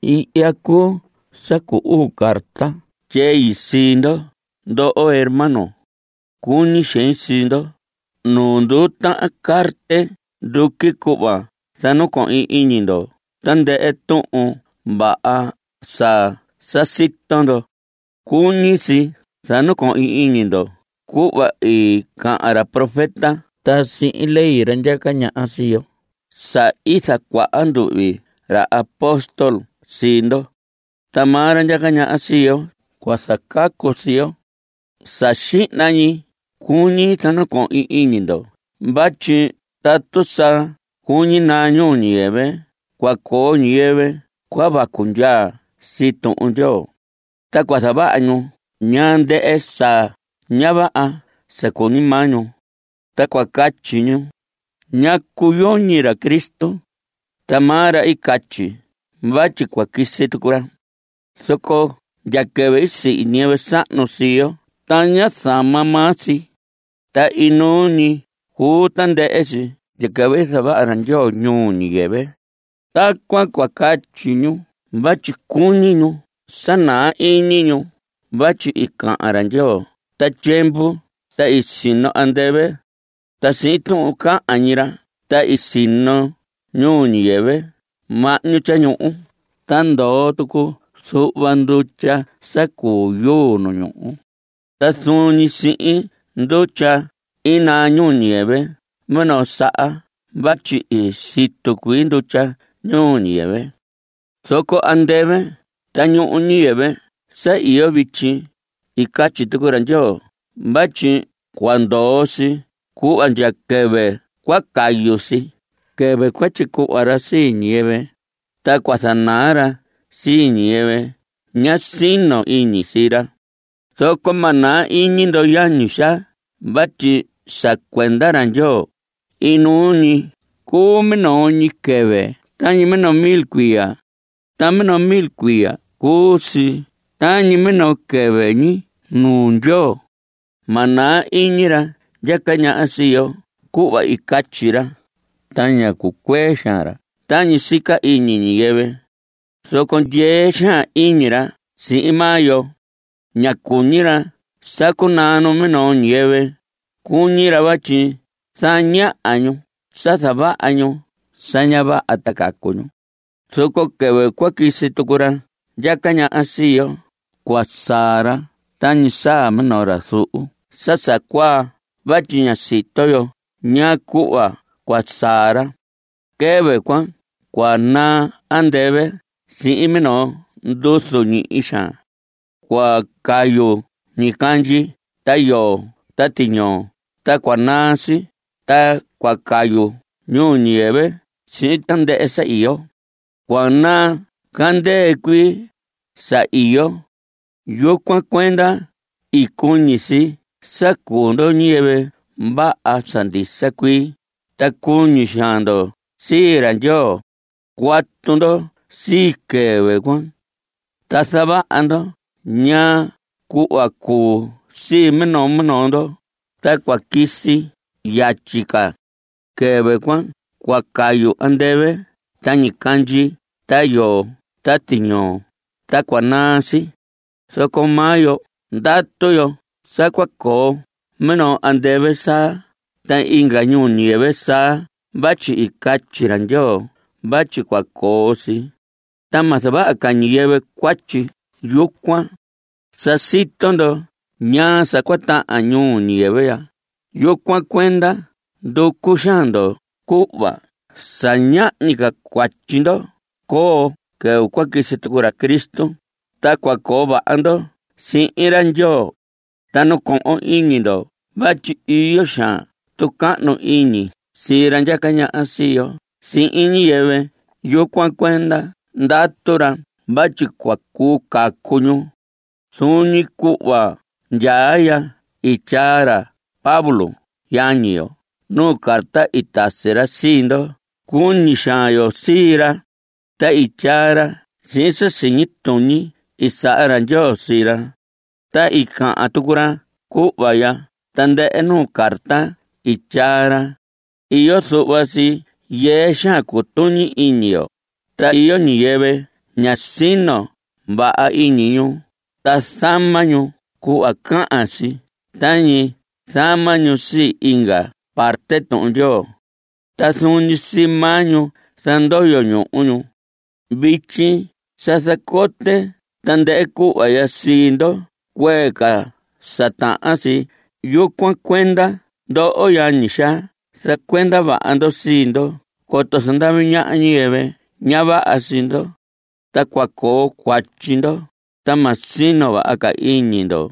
Ihya cuu sa cu uu carta tyei sii ndo, ndoho hermanos. Cuñi xein sii ndo. Nu nduu tahan carte nduqui cuhva zanacohin iñi ndo tandɨhɨ tuhun vaha sa sa sito ndo. Cuñi si sa nacohon iñi ndo cuhva i cahan ra profeta ta sihin ley ra ndyaca ñaha sii yo sa i zacuaha nduhvi ra apóstol sii ndo. Ta maa ra ndyaca ñaha sii yo cua zacacu sii yo. Sa xihna ñi cuñi zanacohin iñi ndo vatyi tatu sa cuñi naa ñuu ñiyɨvɨ cua coo ñiyɨvɨ cua vacu ndyaa sii Tuhun Ndyoo. Ta cua zavaha ñu ñaa ndɨhɨ sa ña vaha sa cuñi maa ñu. Ta cua catyi ñu: “¿Ñacu yoñi ra Cristo? Ta maa ra i catyi vatyi cua quisi tucu ra. Zoco ndya quɨvɨ i sihi ñiyɨvɨ sahnu sii yo ta ña zama maa si, ta inuu ñi cuu tandɨhɨ si ndya quɨvɨ i zavaha ra Ndyoo ñuu ñiyɨvɨ.” Tacuan cua catyi ñu vatyi cuñi ñu sa naa iñi ñu vatyi i cahan ra Ndyoo ta tyiemvu ta i sino andɨvɨ. Ta sihin tuhun cahan ñi ra ta i sino ñuu ñiyɨvɨ mahñu tyañuhu ta ndoo tucu zuhva ndutya sa cu yuu nu ñuhu. Ta zuun ñi sihin ndutya i naa ñuu ñiyɨvɨ minoo saha vatyi i situ cuii ndutya ñuu ñiyɨvɨ. Zoco andɨvɨ ta ñuu ñiyɨvɨ sa iyo vityi, i catyi tucu ra Ndyoo vatyi cua ndoo si cuhva ndya quɨvɨ cua cayu si, quɨvɨ cua tyicuhva ra sii ñiyɨvɨ, ta cua zanaa ra sii ñiyɨvɨ ña sino iñi sii ra. Zoco ma naa iñi ndo yañi xaa vatyi sa cuenda ra Ndyoo, inuu ñi cuu minoo ñi quɨvɨ ta minoo mil cuiya. Ta minoo mil cuiya cuu si tañi minoo quɨvɨ ñi nuu Ndyoo. Ma naa iñi ra ndyaca ñaha sii yo cuhva i catyi ra, ta ña cucuee xaan ra tañi sica iñi ñiyɨvɨ. Zoco ndyee xaan iñi ra sihin maa yo. Ña cuñi ra sa cunaa numinoo ñiyɨvɨ. Cuñi ra vatyi zaña ñu sa zavaha ñu sa ña vaha ta cacu ñu. Zoco quɨvɨ cua quisi tucu ra ndyaca ñaha sii yo, cua saa ra tañi saa minoo ra zuhu sa sa cuaa vatyi ña sito yo ñaa cuhva cua saa ra. Quɨvɨ cuan cua naa andɨvɨ sihin minoo nduzu ñihi xaan. Cua cayu ñicandyi ta yoo ta tiñoo ta cua naa si, ta cua cayu ñuu ñiyɨvɨ sihin tandɨhɨ sa iyo. Cua naa candɨɨ cuii sa iyo. Yucuan cuenda, ¡cuñi si sa cuu ndo ñiyɨvɨ vaha sa ndisa cuii, ta cuñi xaan ndo sii ra Ndyoo! Cuatu ndo sii quɨvɨ cuan, ta zavaha ndo ñaa cuhva cuu sii minoo minoo ndo, ta cua quisi si yatyi ca. Quɨvɨ cuan cua cayu andɨvɨ ta ñicandyi ta yoo ta tiñoo, ta cua naa si. Zoco maa yo ndatu yo sa cua coo minoo andɨvɨ saa ta inga ñuu ñiyɨvɨ saa vatyi i catyi ra Ndyoo vatyi cua coo si. Ta ma zavaha ca ñiyɨvɨ cuatyi yucuan. Sa sito ndo ñaa sa cua tahan ñuu ñiyɨvɨ ya, yucuan cuenda nducu xaan ndo cuhva sa ñahñi ca cuatyi ndo coo quɨvɨ cua quisi tucu ra Cristo, ta cua coo vaha ndo sihin ra Ndyoo. Ta nacohon iñi ndo vatyi iyo xaan tucahnu iñi sii ra ndyaca ñaha sii yo sihin ñiyɨvɨ, yucuan cuenda ndatu ra vatyi cua cuu cacu ñu. Zuun ñi cuhva ndyaa ya i tyaa ra Pablo yañi yo nuu carta i tasi ra sii ndo. Cuñi xaan yo sii ra, ta i tyaa ra sihin sa siñi tuñi i saha ra Ndyoo sii ra. Ta i cahan tucu ra cuhva ya tandɨhɨ nuu carta i tyaa ra. Iyo zuhva si yɨɨ xaan cutuñi iñi yo. Ta iyo ñiyɨvɨ ña sino vaha iñi ñu ta zama ñu cuhva cahan si tañi zama ñu sii inga parte Tuhun Ndyoo. Ta zuun ñi sii maa ñu zandoyo ñuhu ñu. Vityi sa zacote tandɨhɨ cuhva ya sii ndo cuee ca sa tahan si; yucuan cuenda ndoho yañi xaa zacuenda vaha ndo sii ndo coto zandavi ñaha ñiyɨvɨ ña vaha sii ndo, ta cua coo cuatyi ndo, ta ma sino vaha ca iñi ndo.